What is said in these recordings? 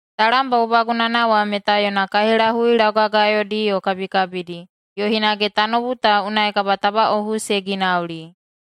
Talam bagubagunana wa meta yona kaihelahui laugagayodi yo kabikabidi, yo hinage tanoubu ta unai kabatabaꞌohu se ginauli.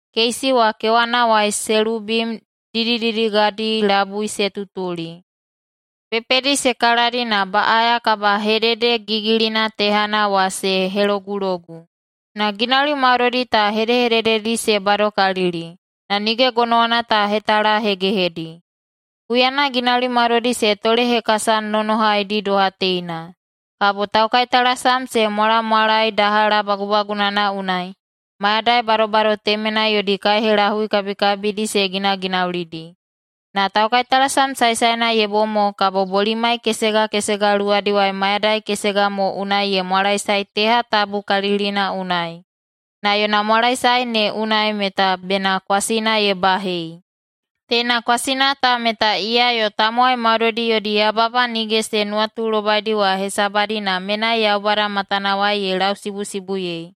Keisi wa kewanawai selubim didididigadi labui se tutuli. Pepedi se kaladi na baꞌaya kabahededegigilina tehana wa se helogulogu. Na ginauli maudoidi ta hedehedededi se badokalili, na nige gonowana ta hetalahegehedi. Huyana ginauli maudoidi se tolehekasanonohaidi doha teina, kabo taukaitalasam se mwalamwalae dahala bagubagunana unai, mayadai badobado temenai yodi kaihelahui kabikabidi se ginaginaulidi. Na taukaitalasam saesaena ye bom mo kabo bolimai kesega kesega luwadiwai mayadai kesega mo unai ye mwalaesae teha tabukalikalilina unai, na yona mwalaesae ne unai meta bena kwasina ye bahei. Teina kwasina ta meta iya yo tamowai maudoidi yodi yababa nige se nuwatulobaidi wa hesabadi na menai Yaubada matanawai ye lausibusibuyei.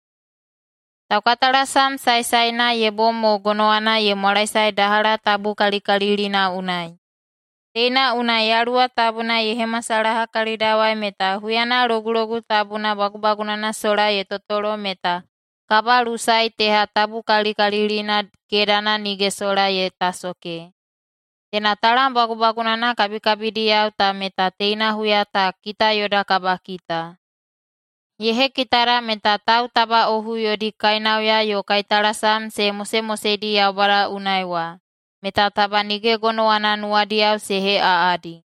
Taukaitalasam saesaena ye bom mo gonowana ye mwalaesae dahala tabukalikalilina unai. Teina unai Yaluwa Tabuna ye hemasalaha kalidawai meta huyana Logulogu Tabuna bagubagunana sola ye totolo meta kabalusae teha tabukalikalilina kedana nige sola ye tasoke. Teina talam bagubagunana kabikabidiyao ta meta teina huya ta kita yoda kabakita. Ye hekitada meta tautabaꞌohu yodi kainauya yo kaitalasam se mosemoseidi Yaubada unai wa, meta taba nige gonowana nuwadiyao se heꞌaꞌadi.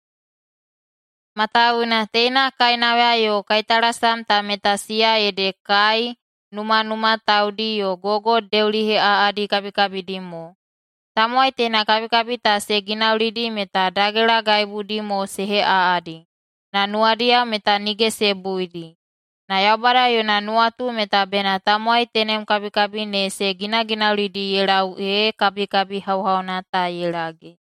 Matawuwuna teina kainauya yo kaitalasam ta meta siya ede kai, numanuma, taudi yo gogo deuliheꞌaꞌadi kabikabidi mo. Tamowai teina kabikabi ta se ginaulidi meta dagelagaibudi mo se heꞌaꞌadi, [na nuwadiyao meta nige se buidi.] Na Yaubada yona nuwatu meta bena tamowai tenem kabikabi ne se ginaginaulidi ye lau ee kabikabi hauhauna ta ye lage.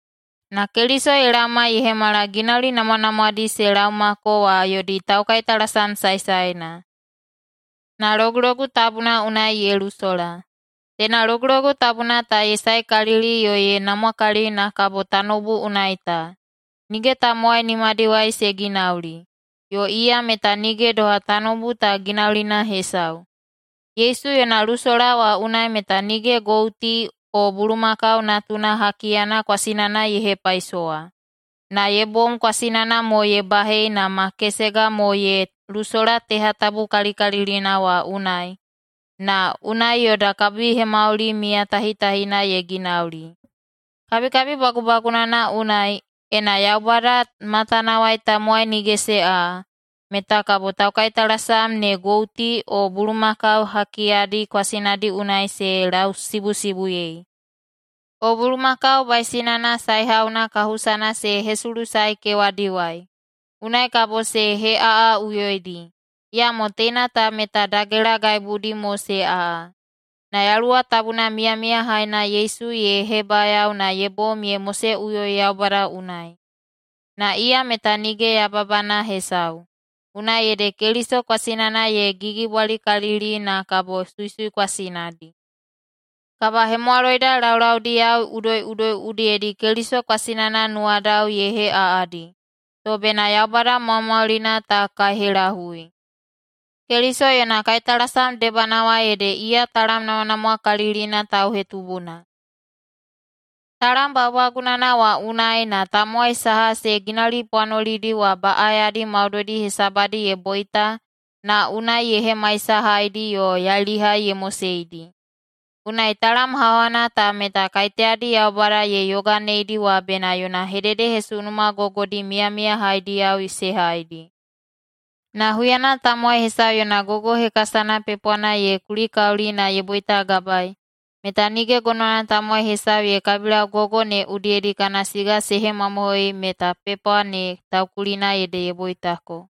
Na Keliso ye laoma ye hemala ginauli namwanamwadi se laomako wa yodi taukaitalasam saesaena, na Logulogu Tabuna unai ye lusola. Teina Logulogu Tabuna ta ye saekalili yo ye namwakalili na kabo tanoubu unai ta. Nige tamowai nimadiwai se ginauli, yo iya meta nige doha tanoubu ta ginaulina hesau. Yesu yona lusola wa unai meta nige gouti o bulumakau natuna hakiyana kwasinana ye hepaisowa, na ye bom kwasinana mo ye bahei na ma kesega mo ye lusola teha tabukalikalilina wa unai, na unai yoda kabihemauli miyatahitahina ye ginauli. Kabikabi bagubagunana unai, ena Yaubada matanawai tamowai nige se aꞌa, meta kabo taukaitalasam ne gouti o bulumakau hakiyadi kwasinadi unai se lausibusibuyei, o bulumakau baisinana saehauna kahusana se hesulusae kewadiwai. Unai kabo se heꞌaꞌaꞌuyoidi. Iyamo teina ta meta dagelagaibudi mo se aꞌa. Na Yaluwa Tabuna Miyamiyahaina Yesu ye hebayao na ye bom ye moseꞌuyoi Yaubada unai. Na iya meta nige yababana hesau. Unai ede Keliso kwasinana ye gigibwalikalili na kabo suisui kwasinadi. Kabahemwaloida laulaudiyao udoiꞌudoi udiyedi Keliso kwasinana nuwadao ye heꞌaꞌadi, to bena Yaubada Maumaulina ta kaihelahui. Keliso yona kaitalasam debanawai ede iya talam namwanamwakalilina tauhetubuna. Talam bagubagunana wa unai na tamowai saha se ginaulipwanolidi wa baꞌayadi maudoidi hesabadi ye boita na unai ye hemaisahaidi yo yailihai ye moseidi. Unai talam hauhauna ta meta kaiteyadi Yaubada ye yoganeidi wa bena yona hededehesunuma gogodi miyamiyahaidiyao se haidi. Na huyana tamowai hesau yona gogo hekasana pepwana ye kulikauli na ye boitagabaei, meta nige gonowana tamowai hesau ye kabilau gogo ne udiyedi kana siga se hemamohoiyei meta pepwa ne taukulina ede ye boitako.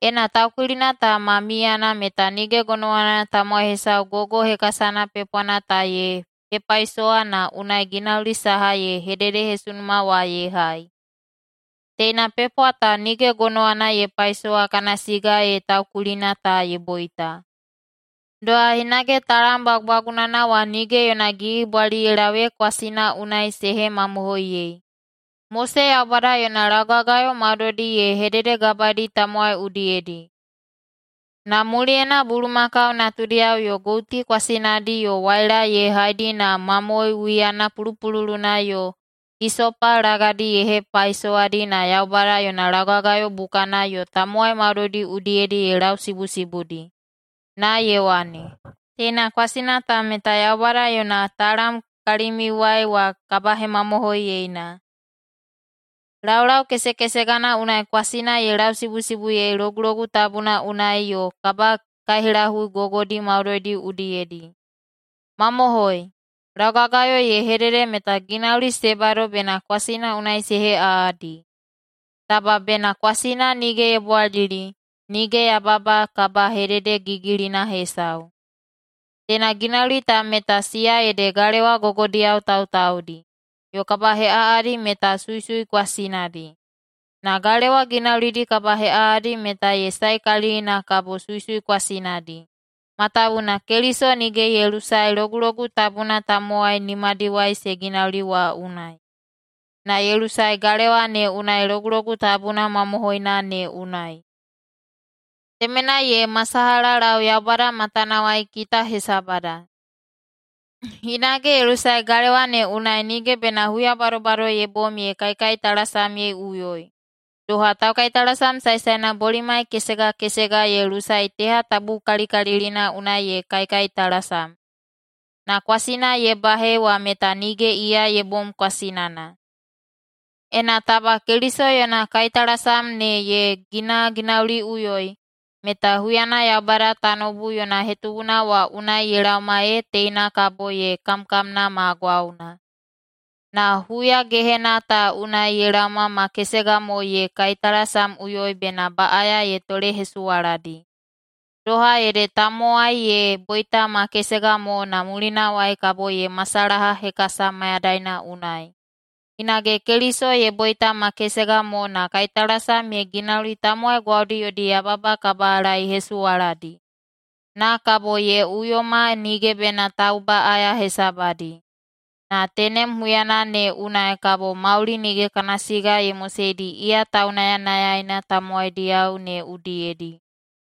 Ena taukulina ta ma miyana meta nige gonowana tamowai hesau gogo hekasana pepwana ta ye hepaisowa na unai ginauli saha ye hededehesunuma wa ye hai. Teina pepwa ta nige gonowana ye paisowa kana siga ee taukulina ta ye boita. Doha hinage talam bagubagunana wa nige yona gigibwali ye lau ee kwasina unai se hemamohoiyei. Mose Yaubada yona laugagayo maudoidi ye hededegabaedi tamowai udiyedi, na muliyena bulumakau natudiyao yo gouti kwasinadi yo waila ye haidi na mamoe wiyana pulupululuna yo hisopa lagadi ye hepaisowadi na Yaubada yona laugagayo bukana yo tamowai maudoidi udiyedi ye lausibusibuidi na ye wane, “Teina kwasina ta meta Yaubada yona talam kalimiuwai wa kabahemamohoiyena.” Laulau kesekesegana unai kwasina ye lausibusibuyei Logulogu Tabuna unai yo kabakaihelahui gogodi maudoidi udiyedi. Mamohoi, laugagayo ye hedede meta ginauli se bado bena kwasina unai se heꞌaꞌadi. Taba bena kwasina nige ye bwalili, nige yababa kabahededegigilina hesau. Teina ginauli ta meta siya ede galewa gogodiyao tautaudi, yo kabaheꞌaꞌadi meta suisui kwasinadi. Na galewa ginaulidi kabaheꞌaꞌadi meta ye saekalili na kabo suisui kwasinadi, matawuwuna Keliso nige ye lusae Logulogu Tabuna tamowai nimadiwai se ginauli wa unai. Na ye lusae galewa ne unai Logulogu Tabuna mamohoina ne unai. Temenai ye masalahalau Yaubada matanawai kita hesabada. Hinage ye lusae galewa ne unai nige bena huya badobado ye bom ye kaikaitalasamyeiꞌuyoi, doha taukaitalasam saesaena bolimai kesega kesega ye lusae teha tabukalikalilina unai ye kaikaitalasam, na kwasina ye bahei wa meta nige iya ye bom kwasinana. Ena taba Keliso yona kaitalasam ne ye ginaginauliꞌuyoi, meta huyana Yaubada tanoubu yona hetubuna wa unai ye laoma ee teina kabo ye kamkamna ma gwauna. Na huya gehena ta unai ye laoma ma kesega mo ye kaitalasamꞌuyoi bena baꞌaya ye tolehesuwaladi. Doha ede tamowai ye boita ma kesega mo na mulinawai kabo ye masalaha hekasa mayadaina unai, hinage Keliso ye boita ma kesega mo na kaitalasam ye ginauli tamowai gwaudi yodi yababa kabalaehesuwaladi. Na kabo ye uyoma nige bena taubaꞌaya hesabadi, na tenem huyana ne unai kabo mauli nige kana siga ye moseidi iya taunayanayaina tamowaidiyao ne udiyedi.